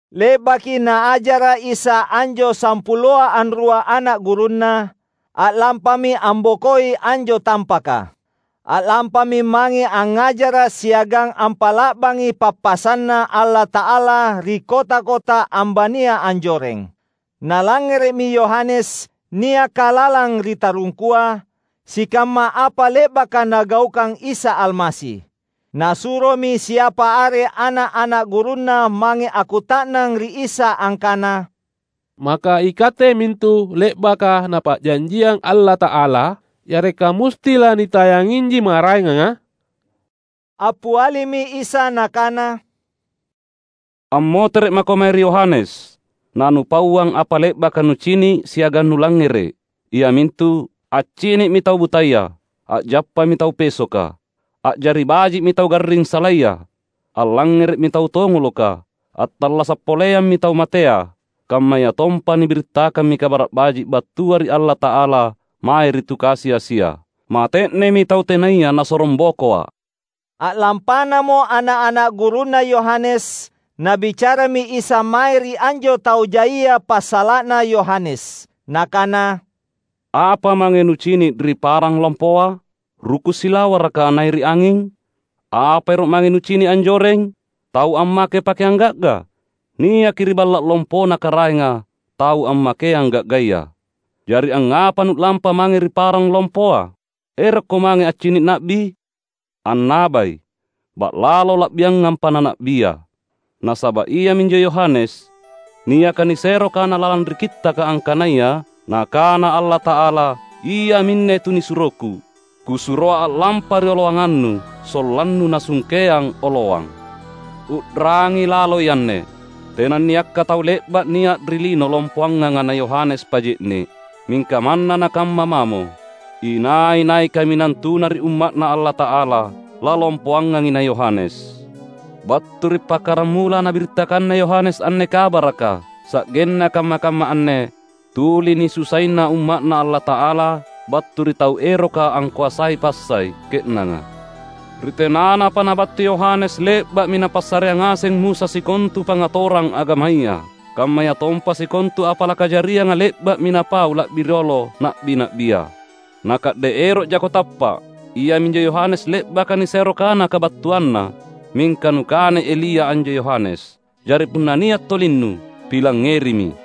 Le’baki Naajara’ Isa anjo sampuloa anrua ana’ gurunNa, a’lampami ambokoi anjo tampaka. A’lampami mange angngajara’ siagang ampa’la’bangi pappasanNa Allata’ala ri kota-kota ambania anjoreng. Nalangngere’mi Yohanes, niaka lalang ri tarungkua, sikamma apa le’baka Nagaukang Isa Almasi. Nasuromi siapa are ana’-ana’ gurunna mange akkuta’nang ri Isa angkana, "Maka iKatte mintu le’baka Napa’janjiang Allata’ala? Yareka musti lanitayanginji maraenganga?" Appialimi Isa Nakana, "Ammotere’ mako mae ri Yohanes nanupauang apa le’baka nucini’ siagang nulangngere’, iamintu: accini’mi tau butaya, a’jappami tau pesoka, a’jari baji’mi tau garring salaya, allangngere’mi tau tongoloka, attallasa’ poleammi tau matea, kammayatompa nibirittakammi Kabara’ Baji’ battua ri Allata’ala mae ri tu kasi-asia. Mate’nemi tau tenaya nasorongbokoA’!" A’lampanamo ana’-ana’ gurunna Yohanes, Nabicarami Isa mae ri anjo tau jaia passala’na Yohanes. Nakana, "Apa mange nucini’ ri parang lompoa? Ruku’ silawaraka nairi’ anging? Apa ero’ mange nucini’ anjoreng? Tau ammake pakeang ga’ga? Niaki ri balla’ lompona karaenga tau ammakeang ga’gaya! Jari angngapa nu’lampa mange ri parang lompoa? Erokko mange accini’ na’bi? Annabai, ba’lalo la’biangampa na na’bia. Nasaba’ iaminjo Yohanes niaka nisero kana lalang ri Kittaka angkanaya, ‘Nakana Allata’ala, iaminne tunisuroKu, Kusuroa a’lampa rioloanganNu sollanNu nasungkeang oloang.’ U’rangi laloi anne! Tenanniakka tau le’ba’ nia’ ri lino lompoanganga na Yohanes Paje’ne’. Mingka manna nakamma mamo, inai-nai kaminang tuna ri umma’Na Allata’ala, lalompoangangi na Yohanes. Battu ri pakkaramula nabirittakanna Yohanes anne kabaraka sa’genna kamma-kamma anne, tuli nisusaina umma’Na Allata’ala battu ri tau eroka angkoasai passai ke’nanga. Ri tenanapa nabattu Yohanes le’ba’mi napassareang ngaseng Musa sikontu pangngatorang agamaya. Kammayatompa sikontu apa lakajarianga le’ba’mi napau la’bi riolo na’bi-na’bia. Na ka’de’ ero’jako tappa’, iaminjo Yohanes le’baka nisero kana kabattuanna. Mingka nukanai Elia anjo Yohanes. Jari punna nia’ tolinnu, pilangngerimi!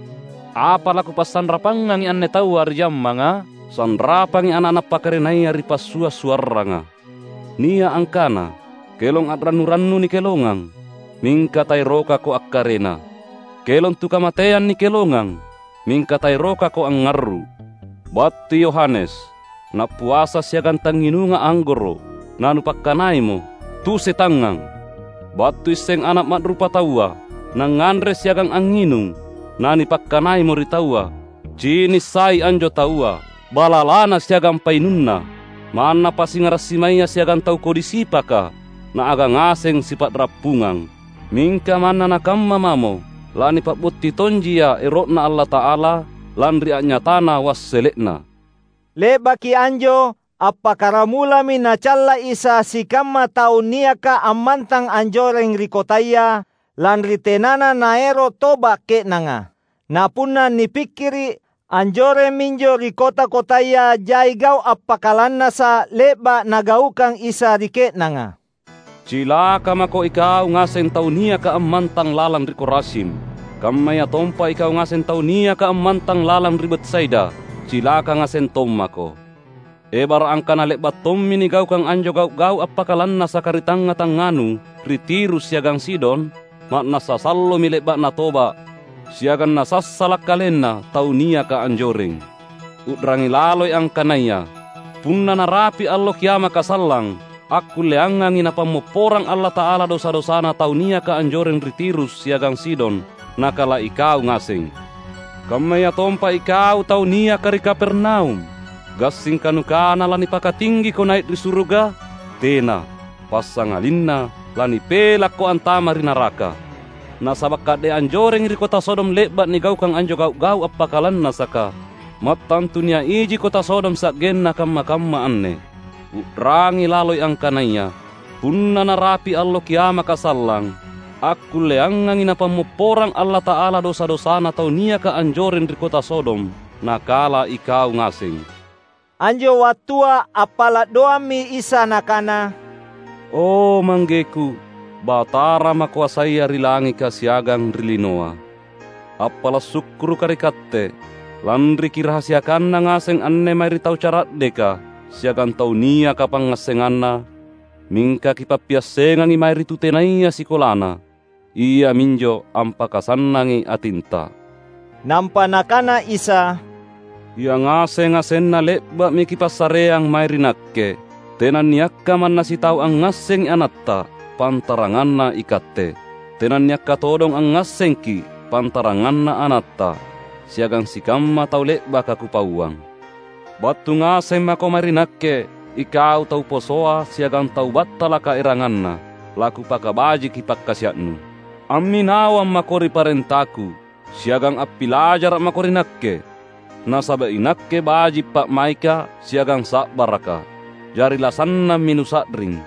Apa laKupasanrapangangi anne taua ri jammanga? Sanrapangi ana’-ana’ pakarenaya ri passua’-suarranga. Nia’ angkana, ‘Kelong a’rannu-rannu nikelongang, mingka taerokako akkarena! Kelong tu kamateang nikelongang, mingka taerokako angngarru’!’ Battui Yohanes — nappuasa siagang tangnginunga anggoro’; nanupakkanaimo, ‘Tu setangngang!’ Battuiseng Ana’ Ma’rupataua — Nangnganre siagang angnginung; nanipakkanaimo ri taua, ‘Cinissai anjo taua, balalana siagang painunna! Manna pasingara’ simaya siagang tau kodi sipaka Naagang ngaseng sipa’rappungang.’ Mingka manna nakamma mamo, lanipa’butti tonjia ero’Na Allata’ala lanri a’nyatana wassele’na." Le’baki anjo appakkaramulami Nacalla Isa sikamma tau niaka ammantang anjoreng ri kotaya, lanri tenana naero’ toba’ ke’nanga. Na punna nipikkiri’, anjoreng minjo ri kota-kotaya jai gau’ appakalannasa’ le’ba’ Nagaukang Isa ri ke’nanga. "Cilaka mako ikau ngaseng tau niaka ammantang lalang ri Korazim! Kammayatompa ikau ngaseng tau niaka ammantang lalang ri Betsaida, cilaka ngaseng tommako! Ebara’ angkana le’ba’ tommi nigaukang anjo gau’-gau’ appakalannasaka ri tangnga-tangnganu ri Tirus siagang Sidon, ma’nassa sallomi le’ba’na toba’ siagang nasassala’ kalenna tau niaka anjoreng. U’rangi laloi angkanaya, punna narapi’ Allo Kiamaka sallang, akkulleangangi Napammopporang Allata’ala dosa-dosana tau niaka anjoreng ri Tirus siagang Sidon nakala ikau ngaseng! Kammayatompa ikau tau niaka ri Kapernaum! Gassingka nukana lanipakatinggiko nai’ ri suruga? Tena! Passangalinna lanipelakko antama’ ri naraka! Nasaba’ ka’de’ anjorengi ri kota Sodom le’ba’ nigaukang anjo gau’-gau’ appakalannasaka, mattantu nia’ iji kota Sodom sa’genna kamma-kamma anne! U’rangi laloi angkanaya, punna narapi’ Allo Kiamaka sallang, akkulleangangi Napammopporang Allata’ala dosa-dosana tau niaka anjoreng ri kota Sodom nakala ikau ngaseng!" Anjo wattua appala’ doammi Isa Nakana, "O ManggeKu, Batara Makoasaya ri langika siagang ri linoa! Appala’ sukkurukKa’ ri Katte, lanri Kirahasiakanna ngaseng anne mae ri tau cara’deka siagang tau niaka pangngassenganna; mingka Kipappiassengangi mae ri tu tenaya sikolana. Iaminjo ampakasannangi atinTa." Nampa Nakana Isa, "Yangaseng-ngasenna le’ba’mi Kipassareang mae ri Nakke. Tenanniakka manna sitau angngassengi AnatTa, pantaranganna iKatte. Tenanniakka todong angngassengKi’, pantaranganna AnatTa, siagang sikamma tau le’baka Kupauang. Battu ngaseng mako mae ri Nakke ikau tau posoa siagang tau battalaka erangnganna; laKupakabajiki pakkasia’nu. Amminawang mako ri parentaKu, siagang appilajara’ mako ri Nakke. Nasaba’ inakke baji’ pa’maikKa’ siagang sa’barakKa’. Jari lasannammi nusa’ring.